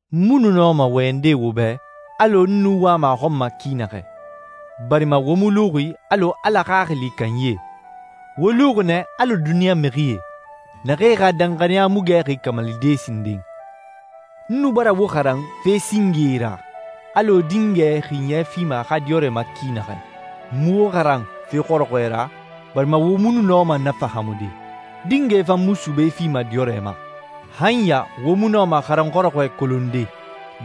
N mu nu nɔma wɔyɛnde wo bɛ alɔ n nu wama a xɔn ma ki naxɛ, barima wo mu luxi alɔ Ala Xaxili kanyie. Wo luxi nɛ alɔ duniɲa mixie, naxee xa danxaniya mu gɛxi kamalide sinden. N nu bara wo xaran fe singee ra, alɔ dingɛ xiɲɛ fima a xa diyɔrɛ ma ki naxɛ. N mu wo xaran fe xɔrɔxɔɛ ra, barima wo mu nu nɔma na fahaamude. Dingɛ fan mu sube fima diyɔrɛ ma. Han ya wo mu nɔma xaranyi xɔrɔxɔɛ kolonde,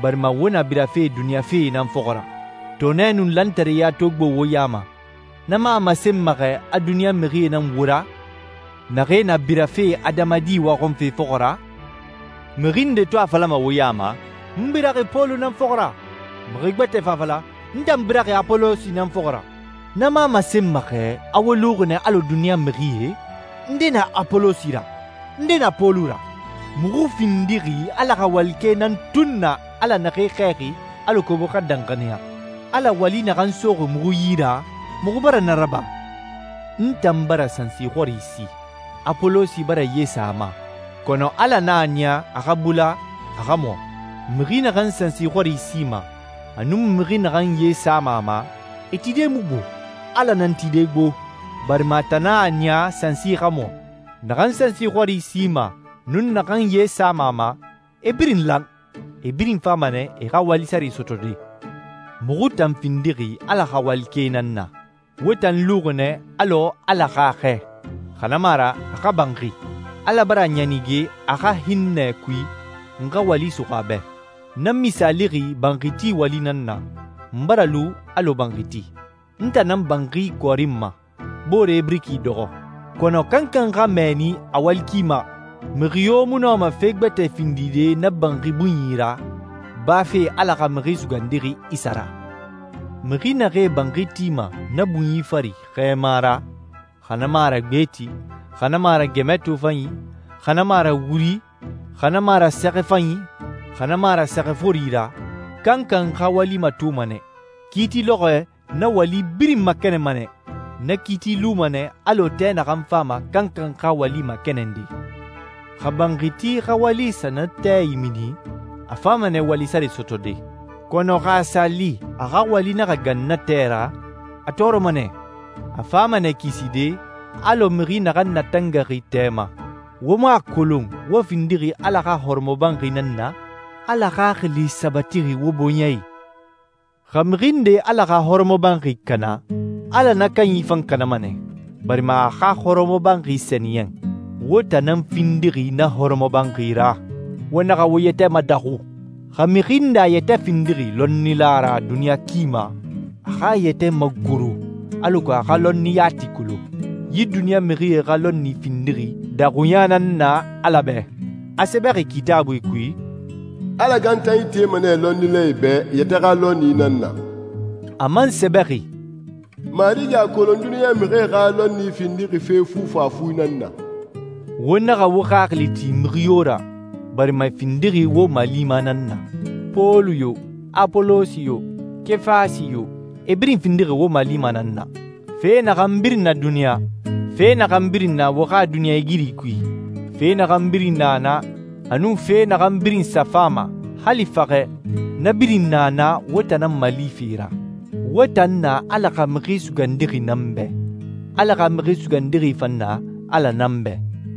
barima wo na birafe duniɲa fee nan fɔxɔ ra. Tɔɔnɛ nun lantareya to gbo wo ya ma, na mu a masenma xɛ a duniɲa mixie nan wo ra, naxee na birafe adamadi waxɔnfe fɔxɔ ra? Mixi nde to a falama wo ya ma, «N biraxi Pɔlu nan fɔxɔ ra,» mixi gbɛtɛ fan a fala, «N tan biraxi Apolosi nan fɔxɔ ra,» na mu a masenma xɛ a wo luxi nɛ alɔ duniɲa mixie? Nde na Apolosi ra? Nde na Pɔlu ra? Muxu findixi Ala xa walikɛe nan tun na Ala naxee xɛɛxi alako wo xa danxaniya. Ala wali naxan soxi muxu yi ra, muxu bara na raba. N tan bara sansi xɔri si, Apolosi bara ye sa a ma, kɔnɔ Ala nan a niya a xa bula, a xa mɔ. Mixi naxan sansi xɔri sima, a nun mixi naxan ye sama a ma, e tide mu gbo. Ala nan tide gbo, barima a tan nan a niya sansi xa mɔ. Naxan sansi xɔri sima, nun naxan ye sama a ma, e birin lan, e birin fama nɛ e xa wali sare sɔtɔde. Muxu tan findixi Ala xa walikɛe nan na. Wo tan luxi nɛ alɔ Ala xa xɛ, xa na mu a ra a xa banxi. Ala bara a ɲanige a xa hinnɛ kui, n xa wali suxu a bɛ. Na misaalixi banxi ti wali nan na. N bara lu alɔ banxiti. N tan nan banxi kɔɔrinma, boore biriki dɔxɔ. Kɔnɔ kankan xa mɛɛni a wali ki ma. Mixi yo mu nɔma fe gbɛtɛ findide na banxi bunyi ra, bafe Ala xa Mixi Sugandixi Isa ra. Mixi naxee banxi tima na bunyi fari xɛɛma ra, xa na mu a ra gbeti, xa na mu a ra gɛmɛ tofanyi, xa na mu a ra wuri, xa na mu a ra sɛxɛ fanyi, xa na mu a ra sɛxɛ fori ra. Kankan xa wali matoma nɛ. Kiiti lɔxɔɛ na wali birin makɛnɛnma nɛ. Na kiiti luma nɛ alɔ tɛ naxan fama kankan xa wali makɛnɛnde. Xa banxiti xa wali sa na tɛ imini, a fama nɛ wali sare sɔtɔde. Kɔnɔ xa a sa li a xa wali naxa gan na tɛ ra, a tɔɔrɔma nɛ. A fama nɛ kiside alɔ mixi naxan natangaxi tɛ ma. Wo mu a kolon wo findixi Ala xa hɔrɔmɔbanxi nan na? Ala Xaxili sabatixi wo bɔɲɛ i. Xa mixi nde Ala xa hɔrɔmɔbanxi kana, Ala na kanyi fan kanama nɛ, barima a xa hɔrɔmɔbanxi sɛniyɛn. Wo tan nan findixi na hɔrɔmɔbanxi ra. Wo naxa wo yɛtɛ madaxu. Xa mixi nde a yɛtɛ findixi lɔnnila ra duniɲa ki ma, a xa a yɛtɛ magoro alako a xa lɔnni yati kolon. Yi duniɲa mixie xa lɔnni findixi daxuɲa nan na Ala bɛ. A sɛbɛxi Kitaabui kui, «Ala gantanyi tema nɛ lɔnnilae bɛ e yɛtɛ xa lɔnni nan na.» A man sɛbɛxi, «Marigi a kolon duniɲa mixie xa lɔnni findixi fe fufafu nan na.» Wo naxa wo xaxili ti mixi yo ra, barima e findixi wo malima nan na. Pɔlu yo, Apolosi yo, Kefasi yo, e birin findixi wo malima nan na. Fe naxan birin na duniɲa, fe naxan birin na wo xa duniɲɛigiri kui, fe naxan birin na na, a nun fe naxan birin sa fama, hali faxɛ, na birin na na wo tan nan malife ra. Wo tan na Ala xa Mixi Sugandixi nan bɛ, Ala xa Mixi Sugandixi fan na Ala nan bɛ.